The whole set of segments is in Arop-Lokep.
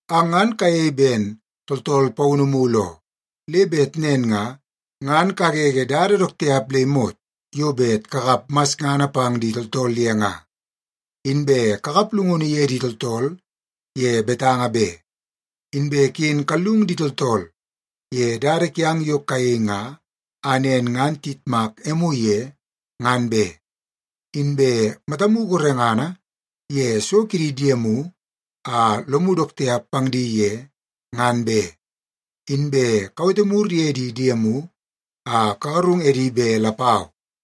Ang ngan kayei ben tooltool paunu mulu oo, le bet nen nga, ngan kagege dada dook tiap le imot yo bet kakap masngana pang di tooltool ye nga. Inbe kakap llungunu ye di tooltool ye betanga be. Inbe ken kallung di tooltool ye dada kiang yo kayei nga a nen ngan tiyitmak emu ye, ngan be. Inbe matamu gorengana ye so ke di diemu a lomu dook tiap pang di ye, ngan be. Inbe kawete mur ye di diemu a kagarung edi be lapau.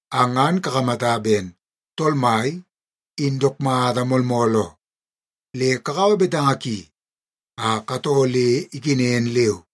Ang ngan kakamata ben Tool Mai in dook mata moolmool oo, le kakaua betanga ki a katoo le ikenen leu.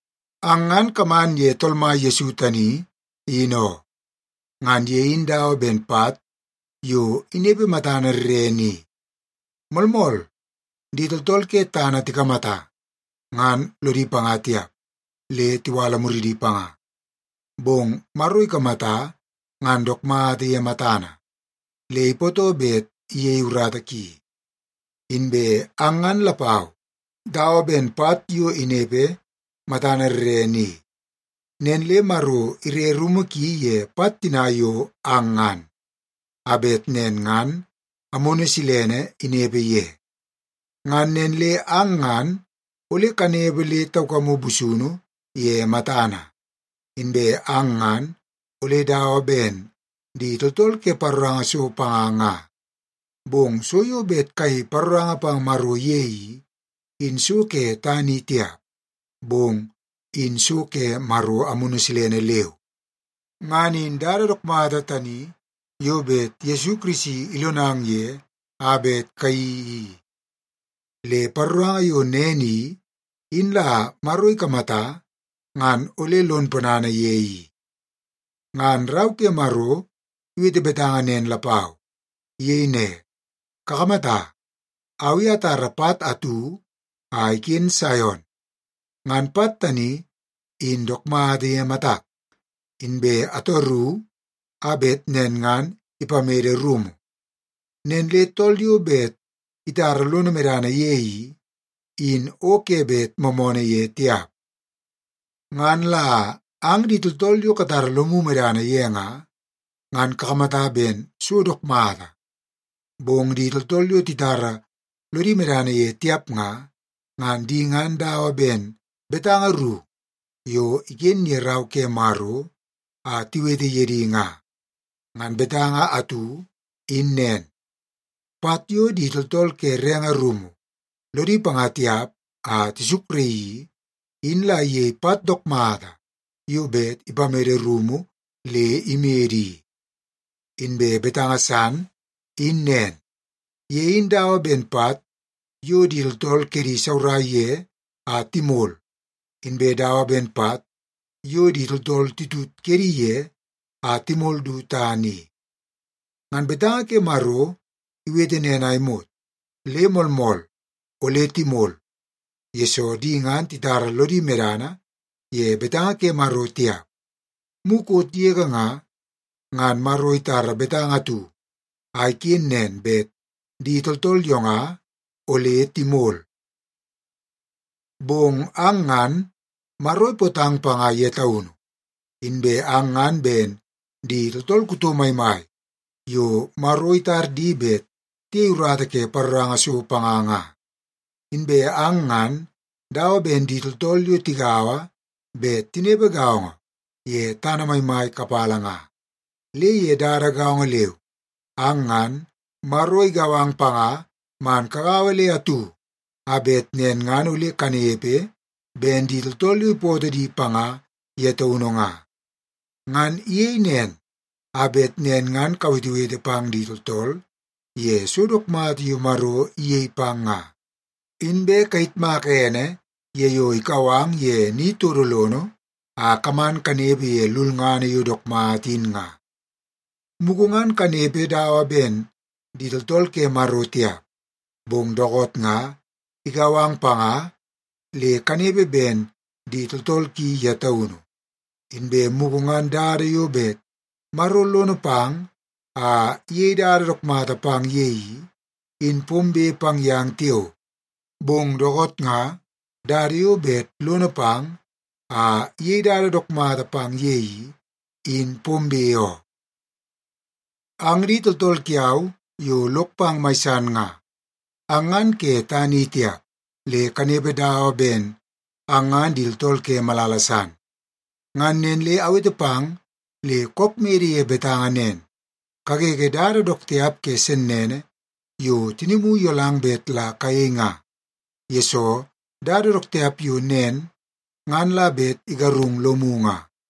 Ang ngan kaman ye Tool Mai Yesu tani in oo. Ngan ye in dawa ben pat yo inepe matana rrene i. Moolmool, di tooltool ke tana tikamata ngan lodi panga tiap le tiwala muridi panga, bong Maro ikamata ngan dook mata ye matana, le ipootoo bet iyei urata ki. Inbe ang ngan lapau dawa ben pat yo inepe matana rrene i. Nen le Maro ire rumu ki ye pat tina yo ang ngan, a bet nen ngan Amunu Silene inepe ye. Ngan nen le ang ngan ole kanepe le taukamu busunu ye matana, inbe ang ngan ole dawa ben di tooltool ke paroranga so panga nga. Bong so yo bet kayei paroranga pang Maro ye i, in so ke tana i tiap, bong in so ke Maro Amunu Silene leu. Ngan in dada dook mata tani yo bet Yesu Kirisi ilonang ye a bet kayeii i. Le paroranga yo nen i, in la Maro ikamata ngan ole lon ponana ye i. Ngan Rau ke Maro iwete betanga nen lapau. Iyei ne, “Kakamata, au i atara pat atu a iken Saion. Ngan pat tani in dook mata ye matak, inbe ataru a bet nen ngan ipamede rumu. Nen le tool yo bet itara lono medana ye i, in o ke bet moomoonoo ye tiap.” Ngan la ang di tooltool yo katara lomu medana ye nga, ngan kakamata ben so dook mata. Bong di tooltool yo titara lodi medana ye tiap nga, ngan di ngan dawa ben betanga ru yo iken ye Rau ke Maro a tiwete ye di nga. Ngan betanga atu in nen, “Pat yo di tooltool ke renge rumu lodi panga tiap a tisukraii i, in la iyei pat dook mata yo bet ipamede rumu le imede i.” Inbe betanga san in nen, “Ye in dawa ben pat yo di tooltool kedi isaurai ye a timol, inbe dawa ben pat yo di tooltool titut kedi ye a timol du tana i.” Ngan betanga ke Maro iwete nen a imot, le moolmool ole timol, yesoo di ngan titara lodi medana ye betanga ke Maro tiap. Mukot yege nga, ngan Maro itara betanga atu a iken nen bet di tooltool yo nga ole timol. Bong ang ngan, Maro ipootang panga ye taunu. Inbe ang ngan ben di tooltool kuto maimai yo Maro itar di bet tiyei urata ke paroranga so panga nga. Inbe ang ngan dawa ben di tooltool yo tigaua bet tinepe gaongo ye tana maimai kapala nga. Le ye dada gaongo leu, ang ngan, Maro igau ang panga man kagaua le atu a bet nen ngan ole kanepe ben di tooltool yo ipootoo di panga ye taunu nga. Ngan iyei nen, a bet nen ngan kawetewete pang di tooltool ye so dook mata yo Maro iyei pang nga, inbe kayitmaka ene ye yo ikau ang ye ni todo lono a kaman kanepe ye lulngana yo dook mata in nga. Mugu ngan kanepe dawa ben di tooltool ke Maro tiap, bong dookoot nga, igau ang panga le kanepe ben di tooltool ki ye taunu. Inbe mugu ngan dada yo bet Maro lono pang a iyei dada dook mata pang ye i, in pombe pang yang tiao. Bong dookoot nga, dada yo bet lono pang a iyei dada dook mata pang ye i, in pombe oo. Ang di tooltool kiau yo lok pang mai san nga, ang ngan ke tana i tiap, le kanepe dawa ben ang ngan di tooltool ke malala san. Ngan nen le awete pang le kook mede ye betanga nen, kagege dada dook tiap ke sennene yo tinimu iyolang bet la kayei nga, yesoo dada dook tiap yo nen ngan la bet igarung lomu nga.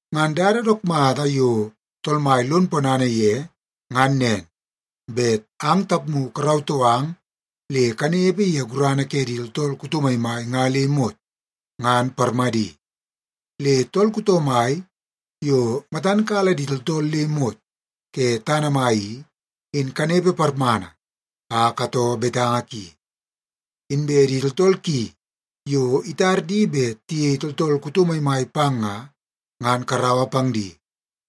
Ngan dada dook mata yo Tool Mai lon ponana ye ngan nen, bet ang tapmu karautoo ang le kanepe ye gurana ke di tooltool kuto maimai nga le imot, ngan parmadi. Le tool kuto mai yo matan kala di tooltool le imot ke tana mai i, in kanepe parmana a katoo betanga ki. Inbe di tooltool ki yo itar di bet tiyei tooltool kuto maimai pang nga, ngan karaua pang di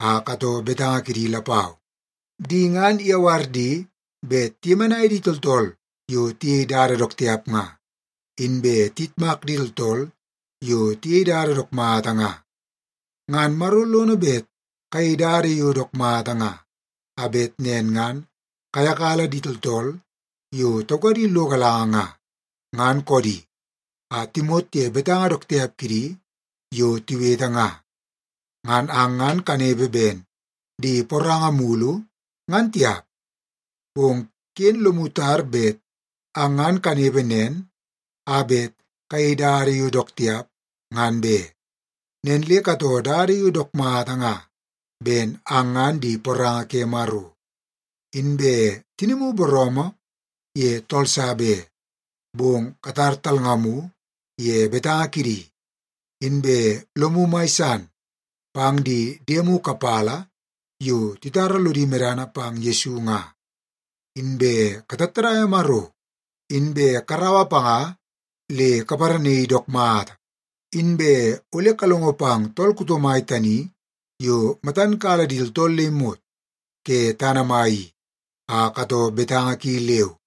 a katoo betanga kidi lapau. Di ngan iyawar di bet tiyemenai di tooltool yo tiyei dada dook tiap nga, inbe tiyitmak di tooltool yo tiyei dada dook mata nga. Ngan Maro lono bet kayei dada yo dook mata nga, a bet nen ngan kayakala di tooltool yo taukadi lo galanga nga, ngan koodi, a timot ye betanga dook tiap kidi yo tiwete nga. Ngan ang ngan kanepe ben di poranga mulu, ngan tiap. Bong ken lomu tar bet ang ngan kanepe nen a bet kayei dada yo dook tiap, ngan be. Nen le katoo dada yo dook mata nga ben ang ngan di poranga ke Maro. Inbe tinimu booroomoo ye tool sa be, bong katar talngamu ye betanga kidi. Inbe lomu mai san pang di diemu kapala yo titara lodi medana pang Yesu nga. Inbe katattadaia Maro, inbe karaua panga le kaparanaii dook mata. Inbe ole kalongo pang tool kuto mai tani yo matan kala di tooltool le imot ke tana mai i, a katoo betanga ki leu.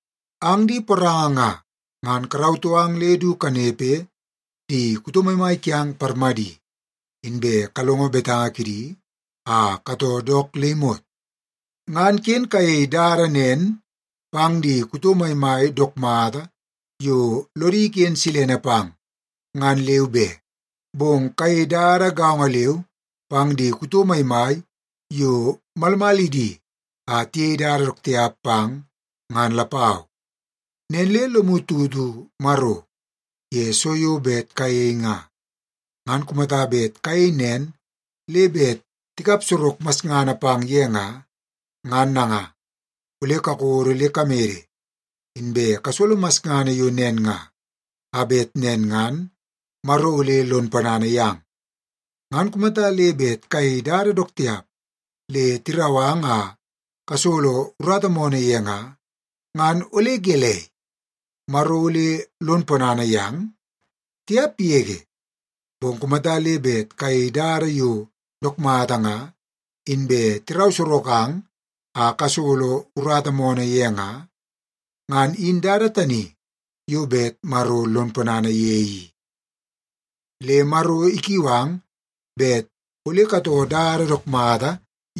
Ang di poranga nga, ngan karautoo ang le du kanepe di kuto maimai kiang parmadi, inbe kalongo betanga kidi a katoo dook le imot. Ngan ken kayei dada nen pang di kuto maimai dook mata yo lodi iken silene pang, ngan leu be. Bong kayei dada gaongo leu pang di kuto maimai yo malmalidi a tiyei dada dook tiap pang, ngan lapau. Nen le lomu tutu Maro ye so yo bet kayei nga, ngan kumata bet kayei nen le bet tikap sorok masngana pang ye nga, ngan nanga, ole kakodo le kamede inbe kasolo masngana yo nen nga, a bet nen ngan Maro ole lon ponana yang. Ngan kumata le bet kayei dada dook tiap le tirau ang a kasolo urata moonoo ye nga, ngan ole gelei, Maro ole lon ponana yang? Tiap yege! Bong kumata le bet kayei dada yo dook mata nga, inbe tirau sorok ang a kasolo urata moonoo ye nga, ngan in dada tani yo bet Maro lon ponana ye i. Le Maro ikiu ang bet ole katoo dada dook mata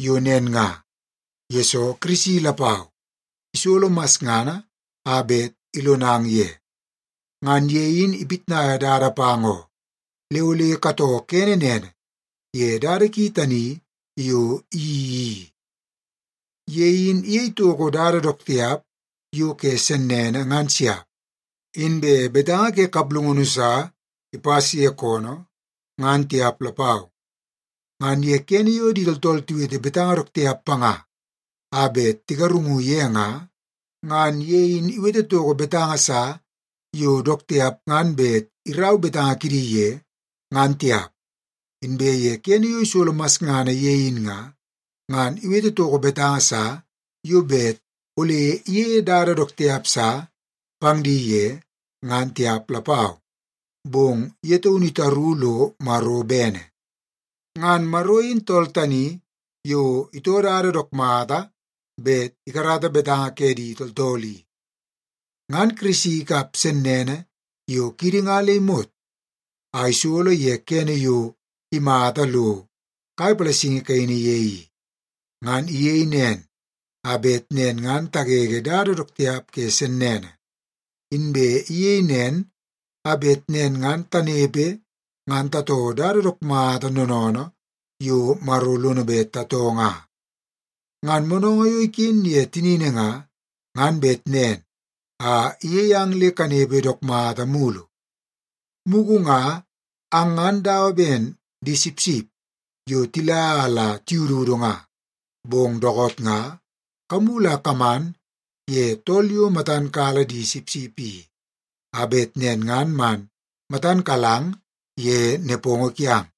yo nen nga, yesoo Kirisi lapau isolo masngana a bet ilonang ye. Ngan ye in ipitnaia dada pang oo, le ole katoo kene nene ye dada ki tani yo iyeii i. “Ye in iyei toko dada dook tiap yo ke sennene ngan siap. Inbe betanga ke kaplungunu sa ipas ye koonoo, ngan tiap lapau.” Ngan ye kene yo di tooltool tiwete betanga dook tiap panga a bet tigarungu ye in nga, ngan ye in iwete toko betanga sa yo dook tiap ngan bet irau betanga kidi ye, ngan tiap. Inbe ye kene yo isolo masngana ye in nga, ngan iwete toko betanga sa yo bet ole iyeie dada dook tiap sa pang di ye, ngan tiap lapau. Bong ye taunu itaru lo Maro bene. Ngan Maro in tool tani yo itoo dada dook mata bet ikarata betanga ke di tooltool i. Ngan Kirisi ikap sennene yo kiidi nga le imot a isolo ye kene yo imata lo kai palasingi kaini ye i. Ngan iyei nen, a bet nen ngan tagege dada dook tiap ke sennene. Inbe iyei nen, a bet nen ngan tanepe ngan tatoo dada dook mata noonoonoo yo Maro lono bet tatoo nga. Ngan moonoongoo yo iken ye tinini nga, ngan bet nen a iyei ang le kanepe dook mata mulu. Mugu nga ang ngan dawa ben di sipsip yo tila a la tiyududu nga, bong dookoot nga kamulu a kaman ye tool yo matan kala di sipsip i, a bet nen ngan man matan kalang ye nepongo kiang.